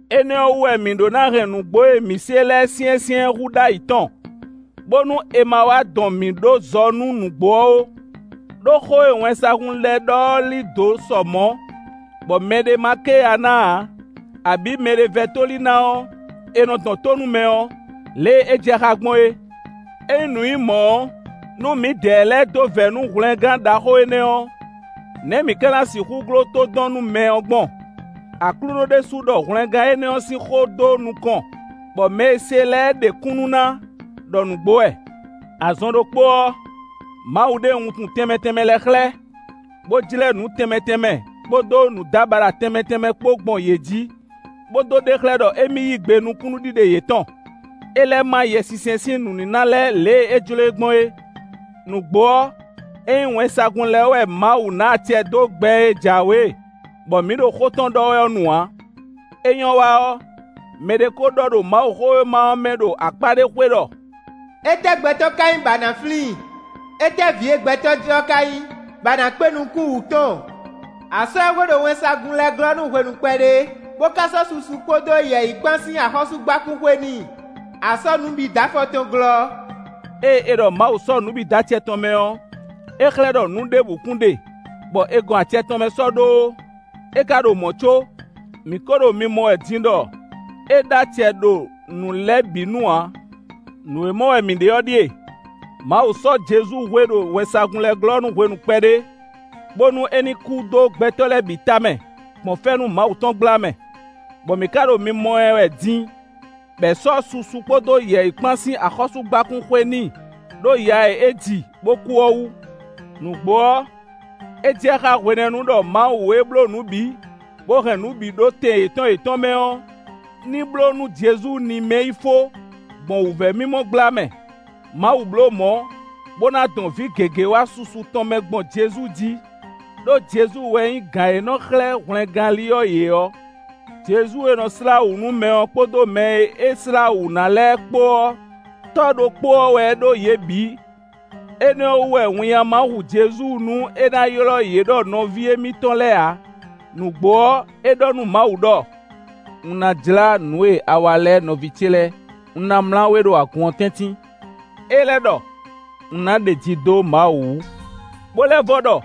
Énɛ́ ɔ́ wú wɛ mǐ ɖó ná hɛn nǔgbó e mǐ se lɛ́ɛ syɛ́nsyɛ́n hú ɖ'ayǐ tɔn, bónú è ma wá dɔn mǐ ɖó zɔ nú nǔgbó ɔ́ ó. Đó xó e wɛnsagun lɛ́ɛ ɖɔ ɔ́ lí dǒ sɔ mɔ̌, bɔ mɛɖé ma ké ya ná ǎ, abǐ mɛɖé vɛ́ tóli ná ɔ́, è nɔ dɔn tó nú mɛ ɔ́, lě e é jɛ xá gbɔn é. Ényí nǔ nyí mɔ̌ ɔ́, nú mǐdɛɛ lɛ́ɛ dó vɛ̌ nú hwlɛngán ɖaxó énɛ́ ɔ́, nɛ̌ mǐ ka ná sixú gló tódɔnnúmɛ ɔ́ gbɔn? Aklúnɔ ɖésú ɖɔ hwlɛngán énɛ́ ɔ́ sín xó dó nukɔn, bɔ mɛ e se lɛ́ɛ ɖe kúnnu ná ɖɔ nǔgbó wɛ. Azɔn ɖokpó ɔ́, Mawu ɖe wuntun tɛnmɛ tɛnmɛ lɛ́ɛ xlɛ́, bó jlɛ́ nǔ tɛnmɛ tɛnmɛ kpódó nǔdábaɖa tɛnmɛ tɛnmɛ kpó gbɔn yě jí, bó dó ɖe xlɛ́ ɖɔ émí yí gbe nú kúnnuɖiɖe yětɔn. É lɛ́ má Yɛsinsɛn sín nǔníná lɛ́ɛ lě e é jló e gbɔn é. Nǔgbó ɔ́, ényí wɛnsagun lɛ́ɛ wɛ Mawu ná acɛ dó gbɛ́ e jǎwe, bɔ mǐ ɖo xó tɔn ɖɔ wɛ ɔ́ nu ǎ. É nyɔ́ wa ɔ́, mɛɖé ko ɖɔ ɖo Mawuxówéma ɔ́ mɛ ɖo akpá ɖé xwé ɖɔ: “Étɛ́ gbɛtɔ́ ka nyí bɔ a nǎ flín i? Étɛ́ vǐ e gbɛtɔ́ ji ɔ́ ka nyí, bɔ a nǎ kpé nukún wǔ tɔn. A sɔ́ ɛ hwe ɖo wɛnsagun lɛ́ɛ glɔ́ nú hwenu kpɛɖé, bó ka sɔ́ susu kpódó yɛ̌yi kpán sín axɔ́súgbákún xwe n'i. A sɔ́ nǔ bǐ dó afɔ tɔn glɔ́.” Ée è ɖɔ Mawu sɔ́ nǔ bǐ dó acɛ tɔn mɛ ɔ́, é xlɛ́ ɖɔ nǔ ɖěbǔ kún ɖe bɔ é gɔn acɛ tɔn mɛ sɔ́ ɖó ó. É ka ɖo mɔ̌ có, mǐ kó ɖo mimɔ wɛ din ɖɔ é ɖó acɛ ɖo nǔ lɛ́ɛ bǐ nu ǎ. Nǔ e mɔ wɛ mǐ ɖe ɔ́ ɖíe: Mawu sɔ́ Jezu hwe ɖo wɛnsagun lɛ́ɛ glɔ́ nú hwenu kpɛɖé, bónú é ní kú dó gbɛtɔ́ lɛ́ɛ bǐ tamɛ gbɔn fɛ́nú Mawu tɔn gbla mɛ, bɔ mǐ ka ɖo mimɔ ɛ wɛ din bɔ è sɔ́ susu kpódó yɛ̌yi kpán sín axɔ́súgbákún xwe n'i ɖó ya e é ji, bó kú ɔ́ wú. Nǔgbó ɔ́, é jɛ xá hwenɛ́nu ɖɔ Mawu e bló nǔ bǐ, bó hɛn nǔ bǐ ɖó tɛn yětɔn yětɔn mɛ ɔ́, ní bló nú Jezu ní mɛ́ yí fó, gbɔn wǔvɛ́mimɔ gbla mɛ. Mawu blǒ mɔ̌, bó ná dɔn vǐ gěgé wá susu tɔn mɛ gbɔn Jezu jí. Đó Jezu wɛ nyí gǎn e nɔ xlɛ́ hwlɛngánli ɔ́ yě ɔ́. Jezu e nɔ slá wǔ nú mɛ ɔ́ kpódó mɛ e é slá wǔ ná lɛ́ɛ kpó ɔ́, tɔ́ ɖokpó ɔ́ wɛ ɖó yě bǐ. Énɛ́ ɔ́ wú wɛ winnyá ma hu Jezu nú é ná ylɔ́ yě ɖɔ nɔví émítɔn lɛ́ɛ ǎ. Nǔgbó ɔ́, é ɖɔ nú Mawu ɖɔ: “Un ná jlá nǔ e a wa lɛ́ɛ nɔví ce lɛ́ɛ; un ná mlá we ɖo agun ɔ́ tɛ́ntin.” É lɛ́ ɖɔ: “Un ná ɖeji dó Mawu wú.” Bó lɛ́ vɔ ɖɔ: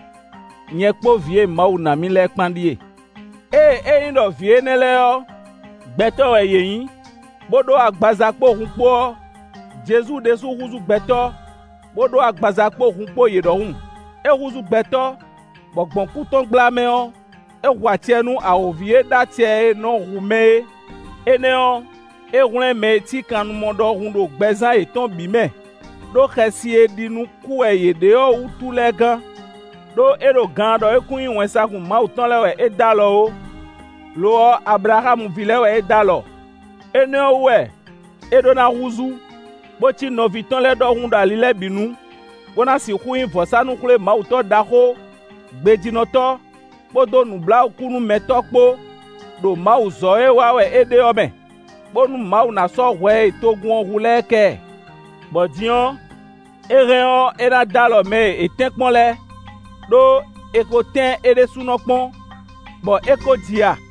“Nyɛ kpó vǐ e Mawu ná mì lɛ́ɛ kpán ɖíe.” Ée ényí ɖɔ vǐ énɛ́ lɛ́ɛ ɔ́, gbɛtɔ́ wɛ yě nyǐ, bó ɖó agbaza kpó hun kpó ɔ́, Jezu ɖésú húzú gbɛtɔ́, bó ɖó agbaza kpó hun kpó yě ɖɔhun. É húzú gbɛtɔ́, bɔ gbɔn kú tɔn gbla mɛ ɔ́, é hu acɛ nú awǒvi e ɖó acɛ e nɔ hu mɛ é; énɛ́ ɔ́, é hwlɛ́n mɛ e cí kannumɔ ɖɔhun ɖo gbɛzán yětɔn bǐ mɛ, ɖó xɛsi e ɖi nú kú wɛ yě ɖe ɔ́ wútu lɛ́ɛ gán. Đó é ɖo gaan ɖɔ é kún nyí wɛnsagun Mawu tɔn lɛ́ɛ wɛ é d'alɔ ó; lo ɔ́, Ablaxámu ví lɛ́ɛ wɛ é d'alɔ. Énɛ́ ɔ́ wú wɛ é ɖó ná húzú, bó cí nɔví tɔn lɛ́ɛ ɖɔhun ɖo ali lɛ́ɛ bǐ nu, bó ná sixú nyí vɔ̌sánú-xwlémawutɔ́ ɖaxó, gbejínɔtɔ́, kpódó nǔbláwǔkúnúmɛtɔ́ kpó ɖo mawuzɔ́ e wa wɛ é ɖe ɔ́ mɛ, bónú Mawu ná sɔ́ hwɛ e togun ɔ́ hu lɛ́ɛ kɛ ɛ. Bɔ din ɔ́, é hɛn ɔ́, é ná dó alɔ mɛ e è tɛ́nkpɔ́n lɛ́ɛ, ɖó è ko tɛ́n é ɖésúnɔ kpɔ́n, bɔ é ko ji ya.